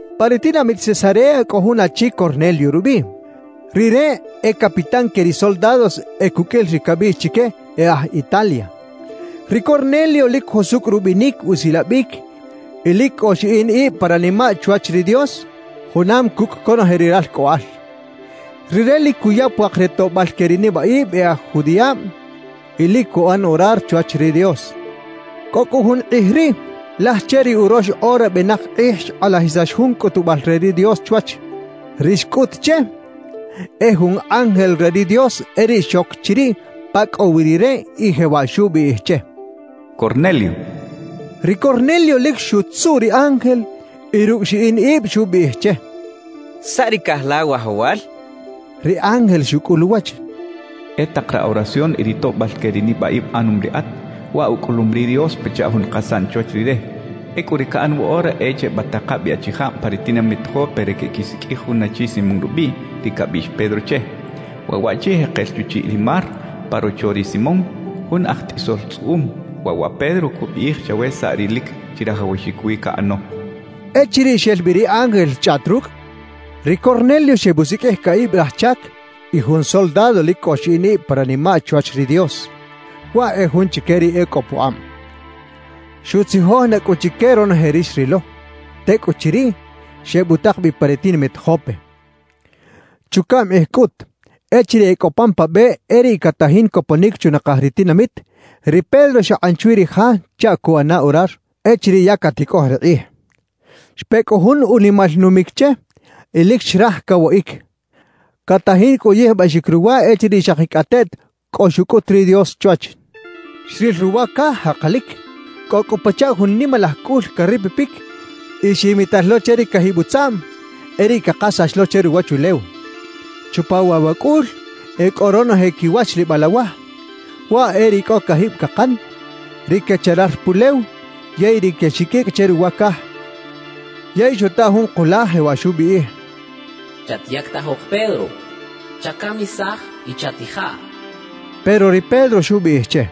Pa ri tinamit Cesarea cꞌo jun achi Cornelio rubiꞌ. Rire e capitán que ri soldados e cuqꞌuil ri cabiꞌx chique “E aj Italia”. Ri Cornelio lic jusucꞌ rubinic usilabic y lic cꞌo xiꞌin ib pa ranimaꞌ chwach ri Dios junam cucꞌ conoje ri ralcꞌoꞌal. Rire lic cuya puak re toꞌbal que ri nibaꞌib e aj judiꞌab y lic cuꞌan orar chwach ri Dios. Cꞌo cꞌu jun kꞌij riꞌ, laj che ri urox ora benak kꞌij xkꞌalajisax jun cꞌutubal re ri Dios chwach. Ri xcꞌut che, e jun ángel re ri Dios e riꞌ xoc chiriꞌ pa cꞌo wi rire y jewaꞌ xubiꞌij che: —¡Cornelio! —xcha che. Ri Cornelio lic xutzuꞌ ri ángel y rucꞌ xiꞌin ib xubiꞌij che: —¿Saꞌ ri caꞌaj la, wajawal? —xchaꞌ. Ri ángel xucꞌul uwach: —E tak ra oración y ri toꞌbal que ri nibaꞌib aꞌanom riꞌat, waꞌ ucꞌulum ri Dios pachaꞌ jun kasaꞌn chwach Rire. Ecꞌu ri caꞌan woꞌora e chebataka bi achijab pa ri tinamit Jope re queꞌquisiqꞌuij jun achi Simón rubiꞌ, ri cabiꞌx Pedro che. Waꞌ waꞌchi jekel chuchiꞌ ri mar pa rocho ri Simón, jun aj tꞌisol tzꞌuꞌum. Waꞌ wa Pedro cubiꞌij chawe saꞌ ri lic chirajawaxic wi caꞌano —xchaꞌ. Echiriꞌ xel bi ri ángel xchꞌaꞌt rucꞌ, ri Cornelio xebusiqꞌuij caꞌib raj chac y jun soldado lic cꞌo xiꞌin ib pa ranimaꞌ chwach ri Dios, waꞌ e jun chique ri e cꞌo pukꞌab. Xutzijoj na cꞌu chique ronoje ri xrilo; tecꞌuchiriꞌ, xebutak bi pa ri tinamit Jope. Chucaꞌm kꞌij cꞌut echiriꞌ e cꞌo pan pa be e riꞌ catajin coponic chunakaj ri tinamit, ri Pedro xakꞌan chwi ri ja chaꞌ cuꞌana orar echiriꞌ ya caticꞌoj ri kꞌij. Xpe cꞌu jun unimal numic che y lic xraj cawaꞌic. Catajin cꞌu uyijbaxic ruwa echiriꞌ xakicꞌateꞌt cꞌo xucꞌut ri Dios chwach. Xril ruwa caj jakalic. Cꞌo cꞌu pachaꞌ jun nimalaj cꞌul caripipic y ximital lo che ri cajib utzaꞌm, e riꞌ cakasax lo che ruwachulew. Chupa waꞌ wa cꞌul e cꞌo ronoje quiwachlibal awaj: waꞌ e ri cꞌo cajib cakan, ri quecharar pulew yey ri quexiqꞌuicꞌ che ruwa caj. Yey xuta jun kulaj jewaꞌ xubiꞌij: —Chatyactajok Pedro; chacamisaj y chatijaꞌ —xcha che. Pero ri Pedro xubiꞌij che: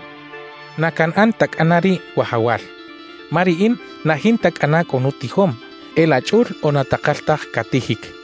—Na canꞌan ta cꞌana riꞌ, Wajawal, ma riꞌin na jinta cꞌana cꞌo nutijom e laꞌ chꞌul o na takal taj catijic —xchaꞌ.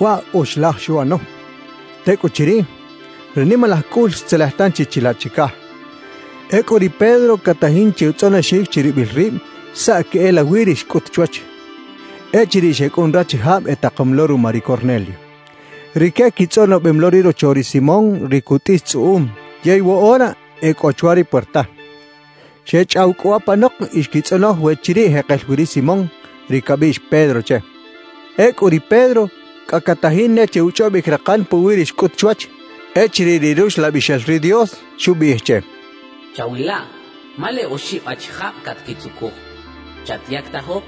Waꞌ oxlaj xuꞌano; tecꞌuchiriꞌ, ri nimalaj cꞌul xtzelej tanchi chilaꞌ chicaj. Ecꞌu ri Pedro catajin che utzꞌonoxic chiribil rib saꞌ queꞌelawi ri xcꞌut chwach, echiriꞌ xecꞌun rachijab etakom lo ruma ri Cornelio. Rique quitzꞌonobem lo ri rocho ri Simón ri cutꞌis tzꞌuꞌum, yey woꞌora e cꞌo chwa ri puerta. Xechꞌaw cꞌu apanok y xquitzꞌonoj we chiriꞌ jekel wi ri Simón, ri cabiꞌx Pedro che. Ecꞌu ri Pedro cꞌa catajin ne che uchꞌobic rakan puwi ri xcꞌut chwach, echiriꞌ ri Ruxlabixel ri Dios xubiꞌij che: «Chawilaꞌ, ma leꞌ oxib achijab catquitzucuj. Chatyactajok,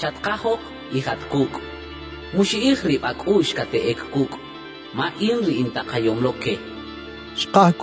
chatkajok y jat cucꞌ. Muxiꞌij rib acꞌuꞌx cateꞌec cucꞌ, ma in ri intakayom lo que» xcha che.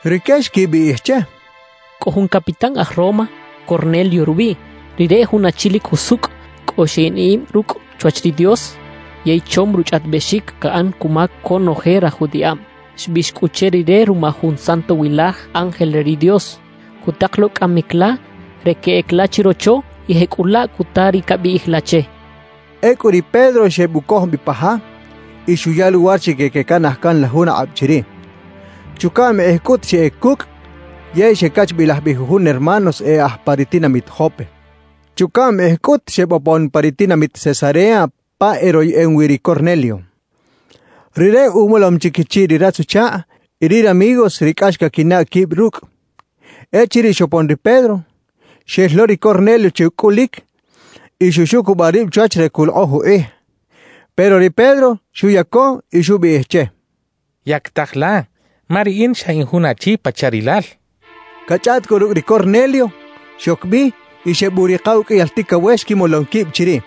Rique xquibiꞌij che: —Cꞌo jun capitán aj Roma, Cornelio rubiꞌ. Rire e jun achi lic jusucꞌ, cꞌo xiꞌin ib rucꞌ chwach ri Dios, yey chom ruchꞌaꞌtibexic caꞌan cuma conoje raj judiꞌab. Xbiꞌx cꞌu che rire ruma jun santowilaj ángel re ri Dios, cutak lo cꞌamic la re queꞌec la chirocho y jecꞌulaꞌ cuta ri cabiꞌij la che —xechaꞌ. Ecꞌu ri Pedro xebucoj bi pa ja y xuya luwar chique quecanaj can la jun akꞌab chiriꞌ. Chucaꞌm kꞌij cꞌut xeꞌec cucꞌ, yey xecachbilaj bi jujun hermanos e aj pa ri tinamit Jope. Chucaꞌm kꞌij cꞌut xebopon pa ri tinamit Cesarea pa eroyeꞌem wi ri Cornelio. Rire umolom chi quichiꞌ ri ratz-uchakꞌ y ri ramigos ri cꞌax caquinaꞌ quib rucꞌ. Echiriꞌ xopon ri Pedro, xel lo ri Cornelio che ucꞌulic y xuxucubaꞌ rib chwach re culokꞌoj ukꞌij. Pero ri Pedro xuyaco y xubiꞌij che: —Yactaja la, ma riꞌin xa in jun achi pachaꞌ rilal —xchaꞌ. Cachꞌaꞌt cꞌu rucꞌ ri Cornelio, xoc bi y xebuꞌrika uqꞌuiyal ticawex quimolom quib chiriꞌ.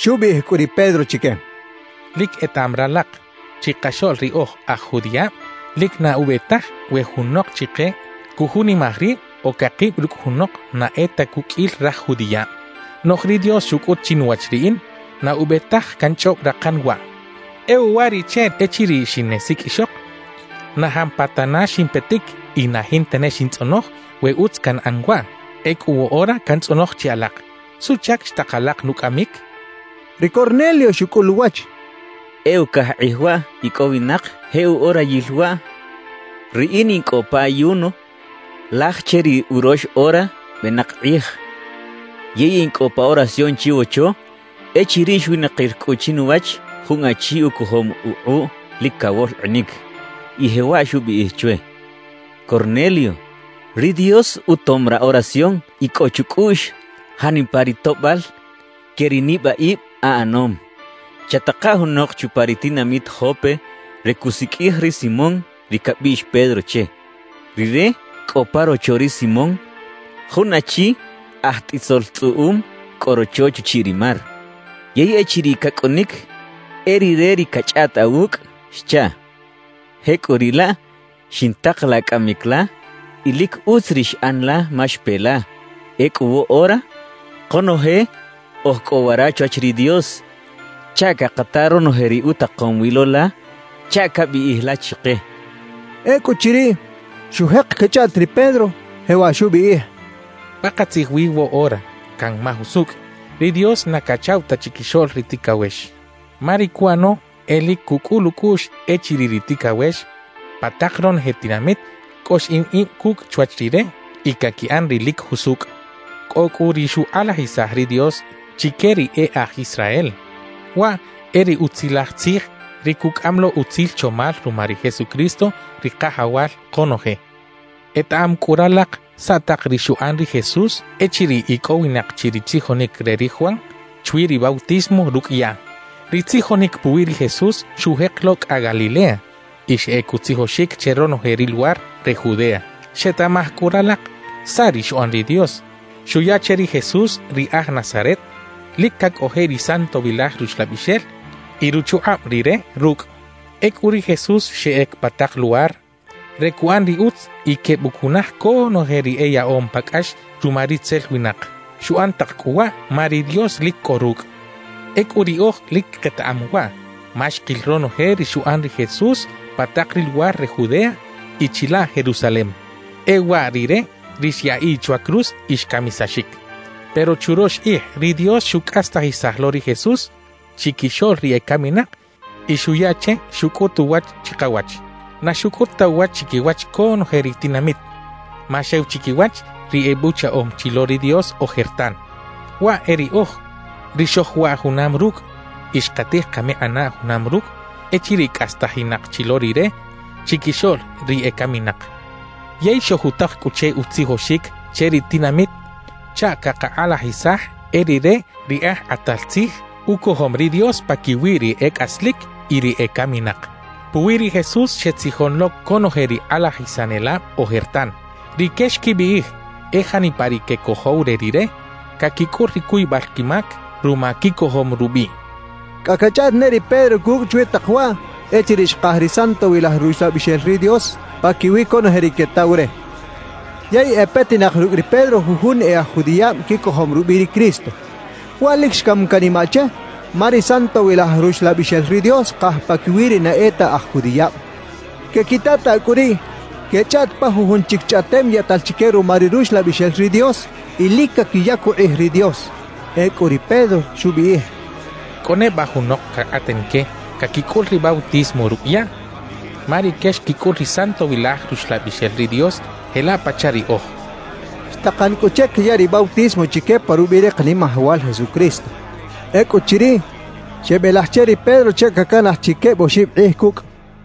Xubiꞌij cꞌu ri Pedro chique: —Lic etaꞌam ralak, chikaxoꞌl ri oj aj judiꞌab lic na ube taj we junok chike cujunimaj rib o cakib rucꞌ junok na e ta cuqꞌuil raj judiꞌab. Noꞌj ri Dios xucꞌut chinuwach riꞌin na ube taj canchꞌob rakan waꞌ. E uwariꞌche, echiriꞌ xineꞌsiqꞌuixok, na jampatana ximpetic y na jinta ne xintzꞌonoj we utz canꞌan waꞌ. Ecꞌu woꞌora cantzꞌonoj che alak, ¿suꞌchac xtak alak nucꞌamic? —xchaꞌ. Ri Cornelio xucꞌul uwach: —E ucaj kꞌij waꞌ icꞌowinak je uꞌorayil waꞌ, riꞌin in cꞌo pa ayuno laj che ri urox ora benak kꞌij, yey in cꞌo pa oración chiwocho echiriꞌ xwinakir cꞌu chinuwach jun achi ucojom ukꞌuꞌ lic cawolkꞌinic y jewaꞌ xubiꞌij chwe: “Cornelio, ri Dios utom ra oración y cꞌo chucꞌuꞌx janipa ri toꞌbal que ri nibaꞌib aꞌanom. Chataka junok chupa ri tinamit Jope re cuꞌsiqꞌuij ri Simón ri cabiꞌx Pedro che. Rire cꞌo pa rocho ri Simón, jun achi aj tꞌisol tzꞌuꞌum cꞌo rocho chuchiꞌ ri mar. Yey echiriꞌ cacꞌunic, e rire ri cachꞌaꞌt awucꞌ” xchaꞌ. »Jecꞌuriꞌlaꞌ, xintakalaꞌ cꞌamic la; y lic utz ri xꞌan la, ma xpe la. Ecꞌu woꞌora, konoje oj cꞌo wara chwach ri Dios chaꞌ cakata ronoje ri utakom wi lo la chaꞌ cabiꞌij la chike —xchaꞌ. Ecꞌuchiriꞌ, xujek cachꞌaꞌt ri Pedro, jewaꞌ xubiꞌij: «Pakatzij wi woꞌora canmaj usucꞌ ri Dios na cachaꞌw ta chiquixoꞌl ri ticawex. Ma ri cuꞌano e lic cucꞌul ucꞌuꞌx echiriꞌ ri ticawex pa tak ronoje tinamit cꞌo xiꞌin ib cucꞌ chwach Rire y caquiꞌan ri lic jusucꞌ. Cꞌo cꞌu ri xukꞌalajisaj ri Dios chique ri e aj Israel; waꞌ e ri Utzilaj Tzij, ri cucꞌam lo utzil chomal ruma ri Jesucristo ri Kajawal konoje. »Etaꞌam cꞌu ralak saꞌ tak ri xuꞌan ri Jesús echiriꞌ icꞌowinak chi ri tzijonic re ri Juan chwi ri bautismo rucꞌ yaꞌ. Ri tzijonic puwi ri Jesús xujek lo cꞌa Galilea y xeꞌec utzijoxic che ronoje ri luwar re Judea. Xetaꞌmaj cꞌu ralak saꞌ ri xuꞌan ri Dios; xuya che ri Jesús ri aj Nazaret lic cacꞌojiꞌ ri Santowilaj Ruxlabixel y ruchukꞌab Rire rucꞌ. Ecꞌu ri Jesús xeꞌec pa tak luwar re cuꞌan ri utz y quebucunaj conoje ri eyaꞌom pa cꞌax ruma ritzel winak. Xuꞌan tak cꞌu waꞌ ma ri Dios lic cꞌo rucꞌ. »Ecꞌu riꞌoj lic ketaꞌam waꞌ ma xkil ronoje ri xuꞌan ri Jesús pa tak ri luwar re Judea y chilaꞌ Jerusalem. E waꞌ Rire ri xyaꞌiꞌ chwa cruz y xcamisaxic. Pero churox kꞌij ri Dios xucꞌastajisaj lo ri Jesús chiquixoꞌl ri ecaminak y xuya che xucꞌut uwach chikawach. Na xucꞌut ta uwach chiquiwach conoje ri tinamit, ma xew chiquiwach ri ebuchaꞌom chi lo ri Dios ojertan; waꞌ e riꞌoj, ri xojwaꞌ junam rucꞌ y xkatij kamikꞌinaꞌ junam rucꞌ echiriꞌ cꞌastajinak chi lo Rire chiquixoꞌl ri ecaminak. »Yey xojutak cꞌu che utzijoxic che ri tinamit chaꞌ cakakꞌalajisaj e Rire ri Aj Kꞌatal Tzij ucojom ri Dios paquiwi ri e cꞌaslic y ri ecaminak. Puwi ri Jesús xetzijon lo conoje ri kꞌalajisanelab ojertan. Rique xquibiꞌij e janipa ri quecojow re Rire, caquicꞌul ri cuybal quimac ruma quicojom rubiꞌ» xchaꞌ. Cꞌa cachꞌaꞌt ne ri Pedro cucꞌ chwi tak waꞌ echiriꞌ xkaj ri Santowilaj Ruxlabixel ri Dios paquiwi conoje ri quetaw re. Yey e petinak rucꞌ ri Pedro jujun e aj judiꞌab quicojom rubiꞌ ri Cristo. Waꞌ lic xcam canimaꞌ che, ma ri Santowilaj Ruxlabixel ri Dios xkaj paquiwi ri na e ta aj judiꞌab. Quequitataꞌ cꞌu riꞌ quechꞌaꞌt pa jujun chic chꞌaꞌtem yaꞌtal chique ruma ri Ruxlabixel ri Dios y lic caquiyac ukꞌij ri Dios. Ecꞌu ri Pedro xubiꞌij: «¿Cꞌo neba junok cakꞌaten que caquicꞌul ri bautismo rucꞌ yaꞌ? Ma rique xquicꞌul ri Santowilaj Ruxlabixel ri Dios jelaꞌ pachaꞌ riꞌoj» xchaꞌ. Xtakan cꞌu che cayaꞌ ri bautismo chique pa rubiꞌ ri Kanimajawal Jesucristo. Ecꞌuchiriꞌ, xebelaj che ri Pedro chaꞌ cacanaj chi queb oxib kꞌij cucꞌ.